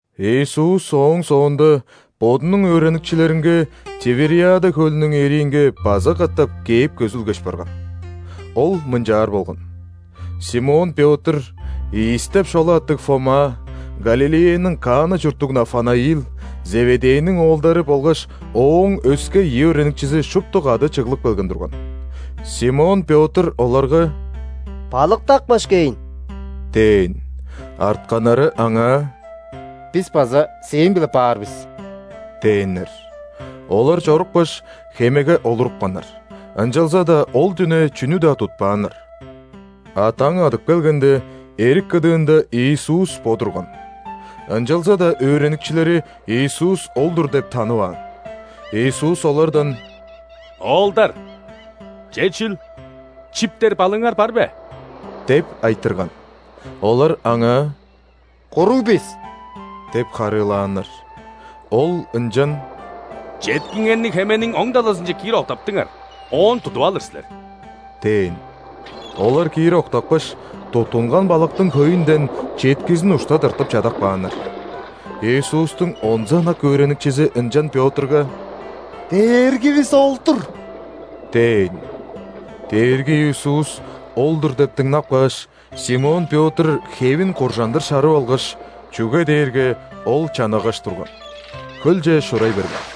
Иисус ооң соонда Бодунуң өөреникчилеринге Тивериада хөлүнүң эриинге база катап кээп көзүлгеш барган. Ол мынчаар болган. Симон Пётр, Ийис деп шола аттыг Фома, Галилеяның Кана чурттуг Нафанаил, Зеведейниң оолдары болгаш Ооң өске ийи өөреникчизи шупту кады чыглып келген турган. Симон Пётр оларга: «Балыктапкаш кээйн» – дээн. Артканнары аңаа: «Бис база сээң-биле баар бис» – дээннер. Олар чорупкаш, хемеге олурупканнар, ынчалза-даа ол дүне чүнү-даа тутпааннар. А даң адып келгенде, эрик кыдыында Иисус бо турган. Ынчалза-даа өөреникчилери Иисус ол-дур деп танываан. Иисус олардан: «Оолдар! Че чүл, чиптер балыыңар бар бе?» – деп айтырган. Олар Аңаа: «Куруг бис» – деп харыылааннар. Ол ынчан: «Четкиңерни хемениң оң талазынче киир октаптыңар, оон тудуп алыр силер» – дээн. Олар киир октапкаш, туттунган балыктың хөйүнден четкизин ушта тыртып чадап кааннар. Иисустуң онза ынак өөреникчизи ынчан Пётрга: «Дээргивис ол-дур!» – дээн. Дээрги Иисус ол-дур деп дыңнап кааш, Симон Пётр хевин куржандыр шарып алгаш (чүге дээрге ол чанагаш турган), хөлче шурай берген.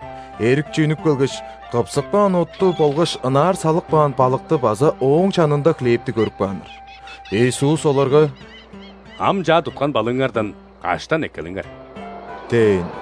Эрикче үнүп келгеш, кыпсып каан отту болгаш ынаар салып каан балыкты база ооң чанында хлебти көрүп кааннар. Иисус оларга: «Ам чаа туткан балыыңардан каштан эккелиңер» – дээн.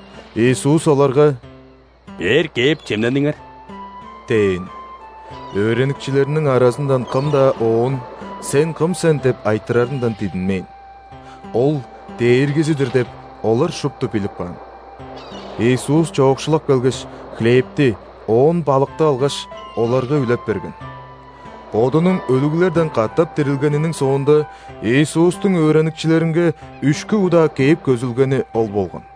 Иисус оларга: «Бээр кээп, чемнениңер» – дээн. Өөреникчилериниң аразындан кым-даа Оон: «Сен кым сен?» – деп айтырарындан дидинмээн. Ол – Дээргизи-дир деп, олар шупту билип каан. Иисус чоокшулап келгеш, хлебти, оон балыкты алгаш, оларга үлеп берген. Бодунуң өлүглерден катап дирилгениниң соонда, Иисустуң өөреникчилеринге үшкү удаа кээп көзүлгени ол болган.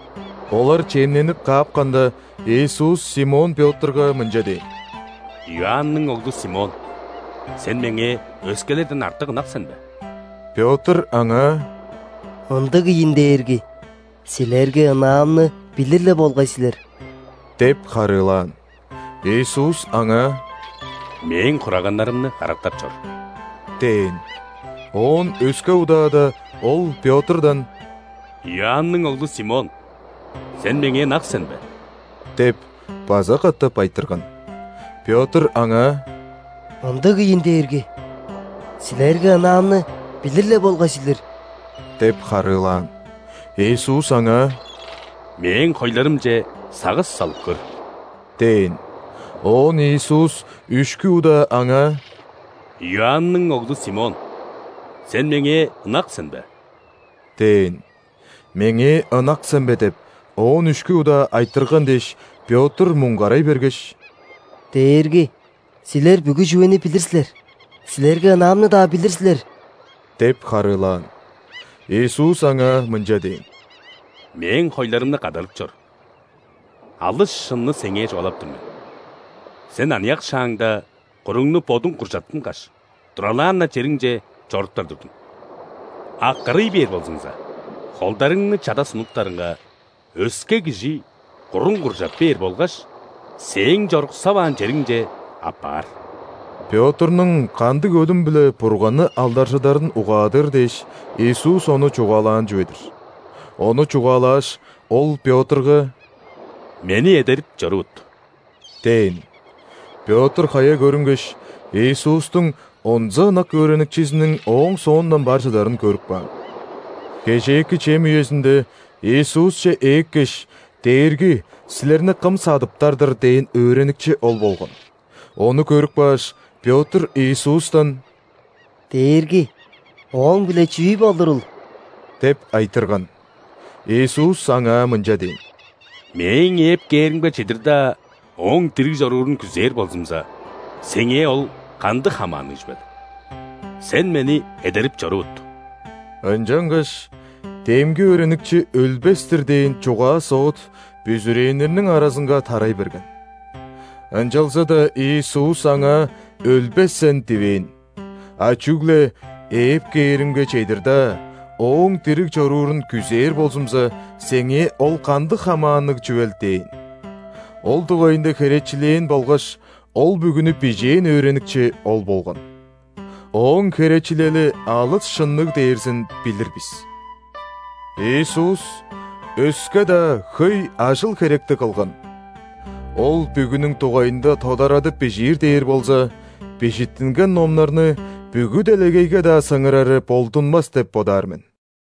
Олар чемненип каапканда, Иисус Симон Пётрга мынча дээн: «Иоанның оглу, Симон! Сен Меңээ өскелерден артык ынак сен бе?» Пётр Аңаа: «Ындыг ийин, Дээрги. Силерге ынаамны билир-ле болгай силер» – деп харыылаан. Иисус аңаа: «Мээң хураганнарымны карактап чор» – дээн. Оон өске удаада Ол Пётрдан: «Иоанның оглу, Симон! Сен Меңээ ынак сен бе?» – деп база катап айтырган. Пётр Аңаа: «Ындыг ийин, Дээрги. Силерге ынаамны билир-ле болгай силер» – деп харыылаан. Иисус аңаа: «Мээң хойларымче сагыш салып көр» – дээн. Оон Иисус үшкү удаа аңаа: «Иоанның оглу, Симон! Сен Меңээ ынак сен бе?» – дээн. «Меңээ ынак сен бе?» – деп, оон үшкү удаа айтырган дээш, Пётр муңгарай бергеш: «Дээрги! Силер бүгү чүвени билир силер. Силерге ынаамны-даа билир силер» – деп харыылаан. Иисус аңаа мынча дээн: «Мээң хойларымны кадарып чор. Алыс шынны сеңээ чугаалап тур мен: сен аныяк шааңда куруңну бодуң куржаттынгаш, туралаан-на чериңче чоруптар турдуң. А кырый бээр болзуңза, холдарыңны чада сунуптарыңга, өске кижи куруң куржап бээр болгаш сээң чоруксаваан чериңче аппаар». (Пётрнуң кандыг өлүм-биле Бурганны алдаржыдарын угаадыр дээш, Иисус ону чугаалаан чүве-дир.) Ону чугаалааш, Ол Пётрга: «Мени эдерип чорувут!» – дээн. Пётр хая көрүнгеш, Иисустуң онза ынак өөреникчизиниң ооң соондан бар чыдарын көрүп каан. Кежээки чем үезинде Иисусче ээккеш: «Дээрги, Силерни кым садыптар-дыр?» – дээн өөреникчи ол болган. Ону көрүп кааш, Пётр Иисустан: «Дээрги! Ооң-биле чүү болурул?» – деп айтырган. Иисус аңаа мынча дээн: «Мээң ээп кээримге чедир-даа ооң дириг чоруурун күзээр болзумза, сеңээ ол кандыг хамаанныг чүвел? Сен Мени эдерип чорувут!» Ынчангаш демги өөреникчи өлбес-тир дээн чугаа-соот бүзүрээннерниң аразынга тарай берген. Ынчалза-даа Иисус аңаа: «Өлбес сен» – дивээн, а чүгле: «Ээп кээримге чедир-даа ооң дириг чоруурун күзээр болзумза, сеңээ ол кандыг хамаанныг чүвел?» – дээн. Ол дугайында херечилээн болгаш ол бүгүнү бижээн өөреникчи ол болган. Ооң херечилели алыс шынныг дээрзин билир бис. Иисус өске-даа хөй ажыл-херекти кылган. Ол бүгүнүң дугайында тодарадып бижиир дээр болза, бижиттинген номнарны бүгү делегейге-даа сыңырары болдунмас деп бодаар мен.